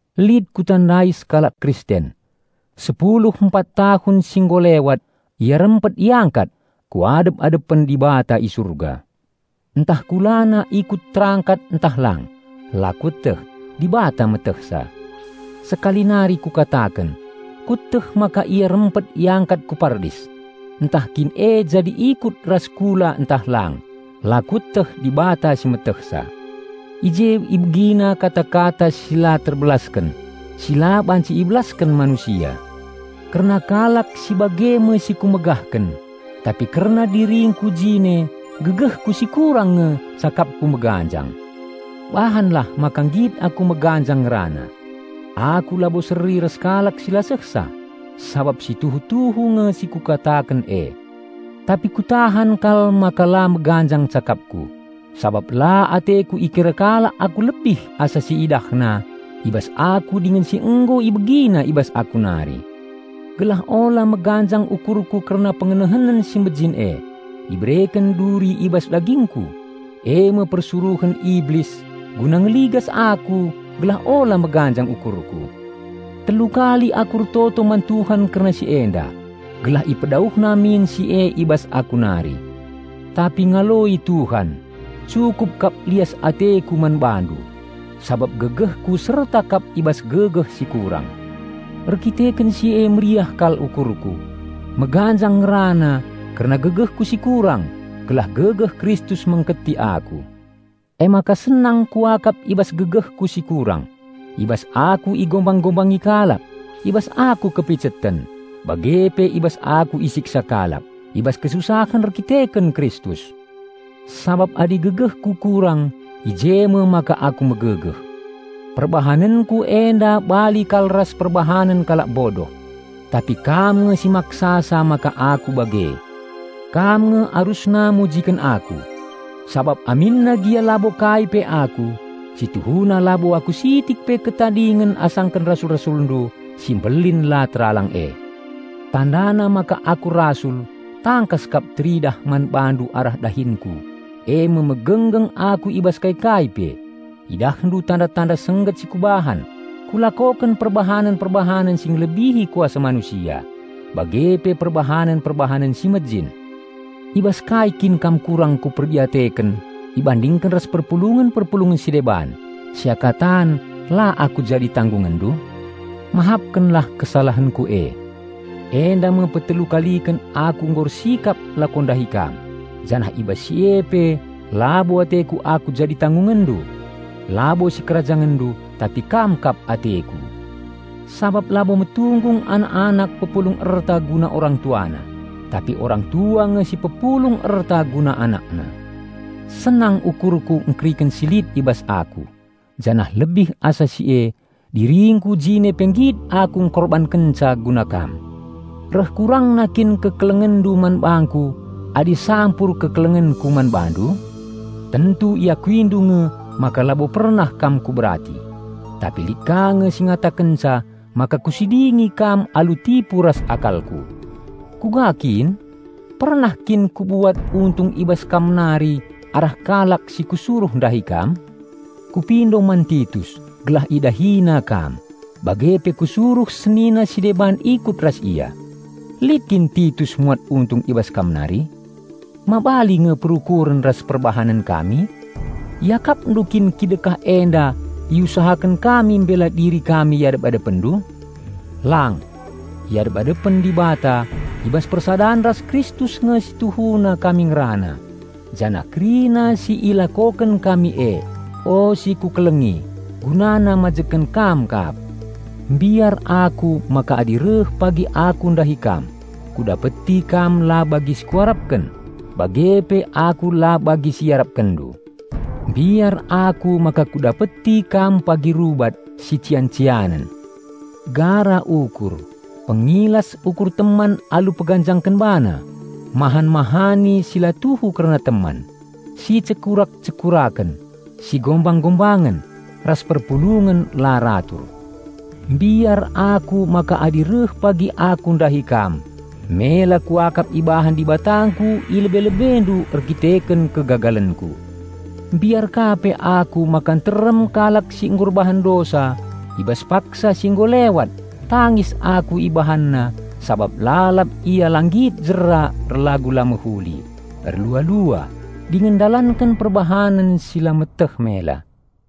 Lit kutandai sekalak Kristen; sepulu empat tahun si nggo lewat ia rempet iangkat ku adep-adepen Dibata i Surga. Ntah kulana ikut terangkat ntah lang, la kueteh -- Dibata metehsa. Sekali nari kukataken: kueteh maka ia rempet iangkat ku Pardis. (Ntah kin e jadi ikut ras kula ntah lang, la kueteh -- Dibata si metehsa.) I je ibegina kata-kata si la terbelasken, si la banci ibelasken manusia. Kerna kalak si bage me si ku megahken tapi kerna diringku jine gegehku si kurang nge cakapku meganjang. Bahanlah maka nggit aku meganjang ngerana; aku labo seri ras kalak si la sehsa, sabap si tuhu-tuhu nge si kukataken e. Tapi kutahan kal maka la meganjang cakapku, sabap la ateku ikira kalak aku lebih asa si iidahna i bas aku dingen si nggo ibegina i bas aku nari. Gelah ula meganjang ukurku kerna pengenehenen si mejin e, ibereken duri i bas dagingku, eme persuruhen Iblis guna ngeligas aku gelah ula meganjang ukurku. Telu kali aku ertoto man Tuhan kerna si enda, gelah ipedauhna min si e i bas aku nari. Tapi ngaloi Tuhan, "Cukup kap lias ateKu man bandu; sabap gegehKu serta kap i bas gegeh si kurang." Erkiteken si e meriah kal ukurku meganjang ngerana kerna gegehku si kurang gelah gegeh Kristus mengketi aku. Emaka senang kuakap i bas gegehku si kurang, i bas aku igombang-gombangi kalak, i bas aku kepiceten, bage pe i bas aku isiksa kalak, i bas kesusahen erdandanken Kristus. Sabap adi gegehku kurang, i je me maka aku megegeh. Perbahanenku enda bali kal ras perbahanen kalak bodoh -- tapi kam nge si maksasa maka aku bage. Kam nge arusna mujiken aku. Sabap aminna gia labo kai pe aku, si tuhuna labo aku sitik pe ketadingen asangken rasul-rasulndu "si mbelin la teralang e". Tandana maka aku rasul tangkas kap teridah man bandu arah dahinku, eme: megenggeng aku i bas kai-kai pe, idahndu tanda-tanda sengget si kubahan, kulakoken perbahanen-perbahanen si ngelebihi kuasa manusia, bage pe perbahanen-perbahanen si mejin. I bas kai kin kam kurang kuperdiateken ibandingken ras perpulungen-perpulungen si deban, seakatan la aku jadi tanggungenndu? Mahapkenlah kesalahenku e. Enda me petelu kaliken aku nggo ersikap lako ndahi kam, janah i bas si e pe labo ateku aku jadi tanggungenndu. Labo sikerajangenndu, tapi kam kap ateku. Sabap labo metunggung anak-anak pepulung erta guna orang tuana, tapi orang tua nge si pepulung erta guna anakna. Senang ukurku engkeriken si lit i bas aku, janah lebih asa si e, diringku jine pe nggit aku engkorbankenca guna kam. Reh kurangna kin kekelengenndu man bangku adi sampur kekelengenku man bandu? Tentu iakuindu nge maka labo pernah kam kuberati. Tapi lit ka nge si ngatakenca maka kusidingi kam alu tipu ras akalku. Kuga kin? Pernah kin kubuat untung i bas kam nari arah kalak si kusuruh ndahi kam? Kupindo man Titus gelah idahinandu, bage pe kusuruh senina si deban ikut ras ia. Lit kin Titus muat untung i bas kam nari? Ma bali nge perukuren ras perbahanen kami? Iakapndu kin kidekah enda iusahaken kami mbela diri kami i adep-adepenndu? Lang! I adep-adepen Dibata, i bas persadan ras Kristus nge si tuhuna kami ngerana. Janah kerina si ilakoken kami e, o si kukelengi, gunana mbangun kam kap. Mbiar aku maka adi reh pagi aku ndahi kam, kudapeti kam la bagi si kuarapken, bage pe aku la bagi si iarapkenndu. Mbiar aku maka kudapeti kam pagi rubat, sician-cianen, gara ukur, pengilas ukur teman alu peganjangken bana, mahan-mahani si la tuhu kerna teman, sicekurak-cekuraken, sigombang-gombangen, ras perpulungen la ratur. Mbiar aku maka adi reh pagi aku ndahi kam, mela kuakap ibahan Dibatangku i lebe-lebendu erkiteken kegagalenku. Mbiar ka pe aku maka nterem kalak si nggo erbahan dosa i bas paksa si nggo lewat tangis aku ibahanna sabap lalap ia la nggit jera erlagu la mehuli, erlua-lua, dingen ndalanken perbahanen si la meteh mela.